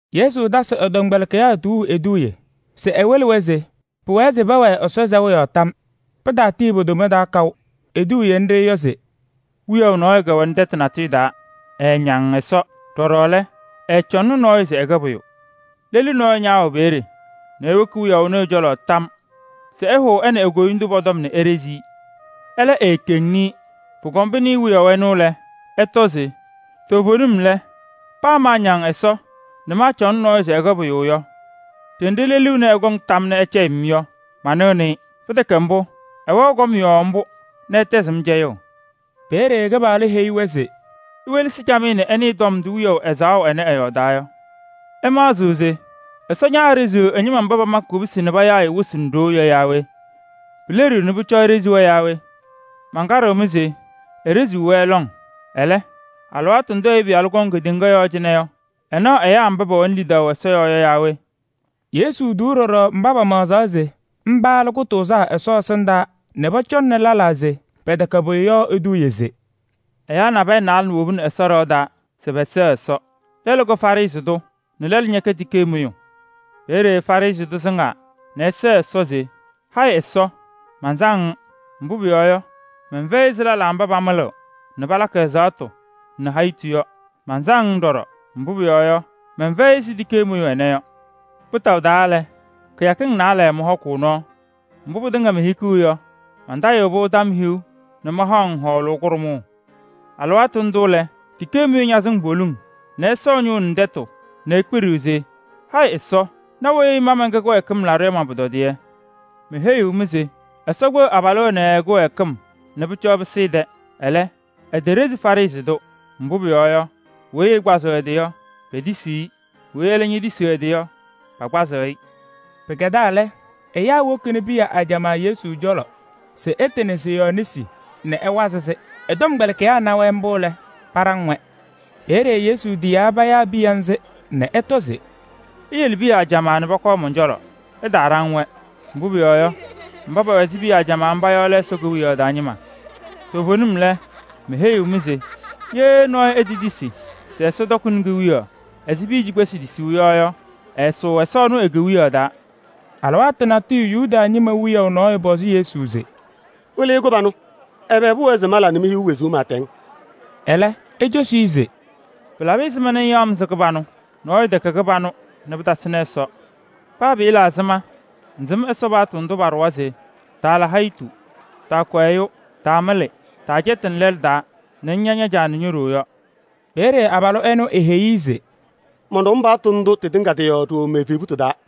Yesu tasɩ ɛ-tɔmkpɛlɩkɩyaa tuuu eduuye se ɛwɩlɩ-wɛ se pʋwɛɛ se pɛwɛɛ Ɛsɔ sɛʋ yɔɔ tam. Pɩtaatii po-toma taa kaʋ. Eduuye nɖɩ yɔ se: “Wiyaʋ nɔɔyʋ kɛwɛnɩ tɛtʋ natʋyʋ taa, ɛɛñaŋ Ɛsɔ. Ɖɔɖɔ lɛ, ɛɛcɔŋnɩ nɔɔyʋ se ɛkɛ pʋyʋ. Lelu nɔɔyʋ ñaawɛ peeye nɛ ewoki wiyaʋ ɛnʋ ɛ-cɔlɔ tam se ɛhʋʋ ɛ nɛ e-koyindu pɔ-tɔm nɛ eɖezi-i. Ɛlɛ, eekeŋni-i. Pʋkɔm pɩnɩɩ wiyaʋ ɛnʋ lɛ, ɛtɔ se: ‘Toovenim lɛ, paa maañaŋ Ɛsɔ nɛ maacɔŋnɩ nɔɔyʋ se ɛkɛ pʋyʋ yɔ, ɖenɖe lelu ɛnɛ ɛkɔŋ tam nɛ ɛcɛyɩɣ-m yɔ, manɩɣnɩ-ɩ. Pɩtɛkɛ mbʋ, ɛwɛɣ kɔm yɔɔ mbʋ nɛ ɛtɛzɩɣ-m cɛyʋʋ.’” Peeye Kɩpaɣlʋ heyi-wɛ se: “Iwelesi camɩyɛ nɛ ɩnɩɩ tɔm ndʋ wiyaʋ ɛzaɣʋ ɛnɛ ɛyɔɔdaa yɔ. Ɩmaɣzɩɣ se Ɛsɔ ñaaɖeziɣ ɛ-ñɩma mba pamakɩ kubusi nɛ payaɣ-ɩ wɩsɩ nɛ ɖoo yɔ yaa we? Pileɖiɣ nɛ pʋcɔ eɖezi-wɛ yaa we? Mankaɖɩɣ-mɩ se: eɖeziɣ-wɛ lɔŋ. Ɛlɛ, alɩwaatʋ ndʋ Ɛyʋ Pɩyalʋ kɔŋ kedeŋa yɔɔ cɩnɛ yɔ, ɛnaɣ ɛyaa mba pɛwɛnɩ lidaʋ Ɛsɔ yɔɔ yɔ yaa we?” Yesu tuu ɖɔɖɔ mba pamaɣzaɣ se mba lɛ kʋtʋʋzaa Ɛsɔ ɛsɩndaa nɛ pɔcɔŋnɩ lɛlaa se pɛtɛkɛ pʋyʋ yɔ eduuye se: “Ɛyaa naalɛ nabɛyɛ wobini Ɛsɔ ɖɩɣa taa se pɛsɛɣ Ɛsɔ. Lɛlʋ kɛ Farɩsɩ tʋ nɛ lɛlʋ ñɛkɛ tikee mʋyʋ. Peeye Farɩsɩ tʋ sɩŋaa nɛ ɛsɛɛ Ɛsɔ se: ‘Hayɩ Ɛsɔ! Mansaŋ-ŋ. Mbʋ pʋyɔɔ yɔ, mɛnfɛyɩ ɛzɩ lɛlaa mba pamɩlɩɣ nɛ palakɩ ɛzaɣtʋ nɛ hayitu yɔ. Mansaŋ-ŋ ɖɔɖɔ, mbʋ pʋyɔɔ yɔ, mɛnfɛyɩ ɛzɩ tikee mʋyʋ ɛnɛ yɔ. Kpɩtaʋ taa lɛ, kɩyakɩŋ naalɛ mɔhɔkʋʋ nɔɔ. Mbʋ pɩtɩŋa mehikiɣ yɔ, mantayɩɣ-pʋ tɔm hiu nɛ mahaɣ-ŋ hɔɔlʋʋ kʋɖʋmʋʋ.’ Alɩwaatʋ ndʋ lɛ, tikee mʋyʋ ñaasɩŋ poliŋ nɛ ɛsɔ ɛ-ñʋʋ nɛ tɛtʋ nɛ ekpiɖiɣ se: ‘Hayɩ Ɛsɔ! Na weyi ma mɛnkɛ kɩwɛɛkɩm laɖʋ yɔ man-pʋtɔdɩyɛ!’ Meheyiɣ-mɩ se Ɛsɔ kpeɣ abalʋ ɛnɛ ɛ-kɩwɛɛkɩm nɛ pʋcɔ ɛpɩsɩ ɛ-tɛ. Ɛlɛ, eteɖezi Farɩsɩ tʋ. Mbʋ pʋyɔɔ yɔ, weyi ɛkpazɩɣ ɛ-tɩ yɔ, petisiɣ-i. Weyi ɛlɛ ñetisiɣ ɛ-tɩ yɔ, pakpazɩ-ɩ.” Pɩkɛdaa lɛ, ɛyaa wokini piya ajamaa Yesu cɔlɔ se ɛtɩnɩ pɔ-yɔɔ nesi nɛ ɛwazɩ pɔ-yɔɔ. Ɛ-tɔmkpɛlɩkɩyaa na-wɛ mbʋ lɛ, paɖaŋ-wɛ. Peeye Yesu tiyaa payaa piya ŋzɩ nɛ ɛtɔ se: “Iyele piya ajamaa nɛ pɔkɔɔ mɔn-cɔlɔ, ɩtaaɖaŋ-wɛ. Mbʋ pʋyɔɔ yɔ, mba pɛwɛ ɛzɩ piya ajamaa mba yɔ lɛ Ɛsɔ Kewiyaɣ taa ñɩma. Toovenim lɛ, meheyiɣ-mɩ se: ye nɔɔyʋ etetisi se Ɛsɔ tɔkɩnɩ kewiyaɣ ɛzɩ piya cikpesi tisuu yɔ yɔ, ɛɛsʋʋ Ɛsɔ ɛnʋ e-Kewiyaɣ taa.” Alɩwaatʋ natʋyʋ Yuda ñɩma wiyaʋ nɔɔyʋ pɔzɩ Yesu se: “Wɩlɩyʋ kɩbanʋ! Ɛbɛ pʋwɛɛ se mala nɛ mehiɣ wezuu pɩɩtɛŋ?” Ɛlɛ ecosi-i se: “Pɩlabɩ ɛzɩma ŋyaɣ-m se kɩbanʋ? Nɔɔyʋ tɛkɛ kɩbanʋ nɛ pɩtasɩnɩ Ɛsɔ. Paa pɩɩla ɛzɩma ŋsɩm Ɛsɔ paɣtʋ ndʋ paɖʋwa se: taala hayitu, taakʋ ɛyʋ, taamɩlɩ, taacɛtɩnɩ lɛlʋ taa nɛ ŋña ña-caa nɛ ño-ɖoo yɔ?” Peeye abalʋ ɛnʋ eheyi-i se: “Mɔnɖɔm paɣtʋ ndʋ tɩtɩŋa tɩ-yɔɔ ɖooo me-evebutu taa.”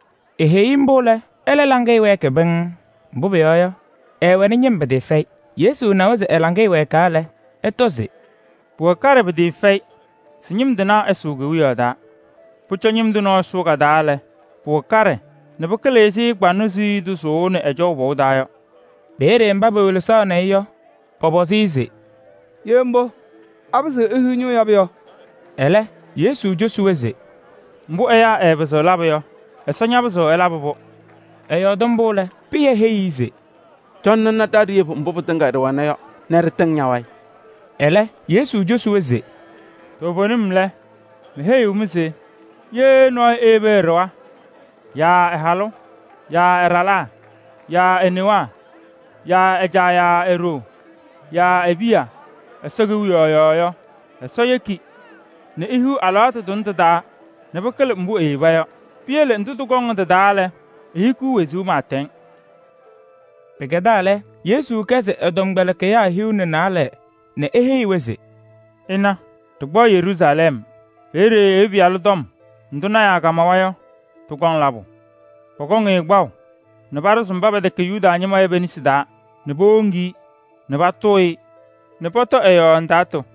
Eheyi-i mbʋ lɛ, ɛlɛ laŋɩyɛ wɛɛkɩ pɩŋŋ, mbʋ pʋyɔɔ yɔ, ɛɛwɛnɩ ñɩm pɩtɩɩfɛyɩ. Yesu nawa se ɛ-laŋɩyɛ wɛɛkaa lɛ, ɛtɔ se: “Pʋwɛ kaɖɛ pɩtɩɩfɛyɩ se ñɩm tɩnaa ɛsʋʋ Ɛsɔ Kewiyaɣ taa! Pʋcɔ ñɩm tʋ nɔɔyʋ sʋʋ ka-taa lɛ, pʋwɛ kaɖɛ nɛ pɩkɩlɩ ɛzɩ kʋyʋndʋʋ kpaŋnɔ sʋʋnɩ ɛjɔʋ pɔʋ taa yɔ.” Peeye mba pewelesaɣnɩ-ɩ yɔ, pɔpɔzɩ-ɩ se: “Ye mbʋ, apɩzɩɣ ehiɣ ñʋʋ yabʋ yɔ?” Ɛlɛ Yesu cosi-wɛ se: “Mbʋ ɛyaa ɛɛpɩzɩɣ labʋ yɔ, Ɛsɔ ñapɩzɩɣ ɛlabɩ-pʋ.” Ɛyɔɔdɩ mbʋ lɛ, Pɩyɛ heyi-i se: “Cɔnɩ ŋna ɖa ɖeyebu mbʋ pɩtɩŋa ɖɩwɛna yɔ nɛ ɖɩtɩŋ ña-wayɩ.” Ɛlɛ Yesu cosi-wɛ se: “Toovenim lɛ, meheyiɣ-mɩ se ye nɔɔyʋ eyebi ɛ-ɖɩɣa yaa ɛ-halʋ yaa ɛ-ɖalaa yaa e-newaa yaa ɛ-caa nɛ e-ɖoo yaa e-piya Ɛsɔ Kewiyaɣ yɔɔ yɔ, Ɛsɔ yeki nɛ ehiɣ alɩwaatʋ tʋnɛ tɩ-taa nɛ pɩkɩlɩ mbʋ eyeba yɔ. Piyele ndʋ tɩkɔŋ yɔ tɩ-taa lɛ, ehikiɣ wezuu pɩɩtɛŋ.” Pɩkɛdaa lɛ, Yesu kɛsɩ ɛ-tɔmkpɛlɩkɩyaa hiu nɛ naalɛ nɛ eheyi-wɛ se: “Ɩna, ɖɩkpaɣ Yeruusalɛm. Peeye Ɛyʋ Pɩyalʋ tɔm ndʋ tɩtɩŋa payɩ lɔɔyɩsɩ tɩnaa kamawa yɔ, tɩkɔŋ labʋ. Pɔkɔŋ-ɩ kpaʋ nɛ paɖʋzɩ mba pɛtɛkɛ Yuda ñɩma yɔ pe-nesi taa nɛ powoŋ-i nɛ patʋʋ-ɩ nɛ pɔtɔ ɛ-yɔɔ ndaatʋ.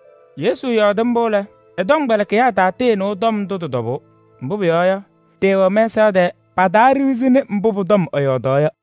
Yesu yɔɔdɩ mbʋ lɛ, ɛ-tɔmkpɛlɩkɩyaa tatɩɩnɩʋ tɔm ndʋ tɩ-tɔbʋʋ. Mbʋ pʋyɔɔ yɔ, tɩɩwɛ-wɛ mɛsaɣ tɛɛ. Pataaɖiɣzini mbʋ pʋ-tɔm ɛyɔɔdaɣ yɔ.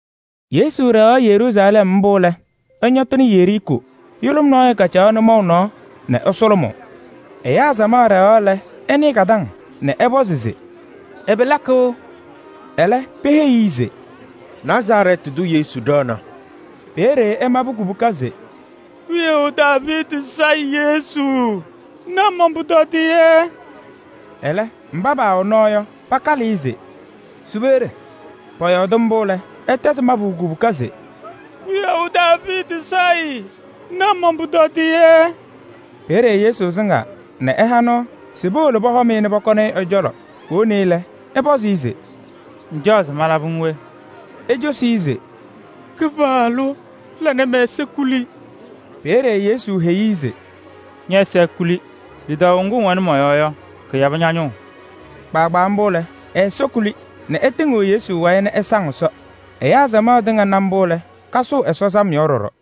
Yesu ɖɛɣaɣ Yeruusalɛm mbʋ lɛ, ɛñɔtɩnɩ Yeriikoo. Yʋlʋm nɔɔyʋ kacaɣ nʋmɔʋ nɔɔ nɛ ɛsʋlʋmʋʋ. Ɛyaa samaɣ ɖɛɣaɣ lɛ, ɛnɩɩ ka-taŋ nɛ ɛpɔzɩ se: “Ɛbɛ lakɩɣ?” Ɛlɛ peheyi-i se: “Nazarɛɛtɩ tʋ Yesu ɖɛɣna.” Peeye ɛmabɩ kubuka se: “Wiyaʋ Daaviidi Sayɩ Yesu! Na man-pʋtɔdɩyɛ!” Ɛlɛ mba paawɛ nɔɔ yɔ, pakalɩ-ɩ se: “Su peeye!” Pɔyɔɔdɩ mbʋ lɛ, ɛtɛzɩ mabʋ kubuka se: “Wiyaʋ Daaviidi Sayɩ! Na man-pʋtɔdɩyɛ!” Peeye Yesu sɩŋaa nɛ ɛha nɔɔ se powolo pɔhɔm-ɩ nɛ powoni-i ɛ-cɔlɔ. Powoni-i lɛ, Yesu pɔzɩ-ɩ se: “Ŋcaɣ se malabɩ-ŋ we?” Ecosi-i se: “Kɩpaɣlʋ! La nɛ mɛ-ɛza kuli.” Peeye Yesu heyi-i se: “Ñɛ-ɛza ekuli! Lidaʋ ŋgʋ ŋwɛnɩ mɔ-yɔɔ yɔ, kɩyabɩ ña-ñʋʋ.” Kpaagbaa mbʋ lɛ, ɛ-ɛza kuli nɛ ɛtɩŋɩɣ Yesu wayɩ nɛ ɛsaŋ Ɛsɔ. Ɛyaa samaɣ tɩŋa na mbʋ lɛ, kasʋʋ Ɛsɔ sam yɔɔ ɖɔɖɔ.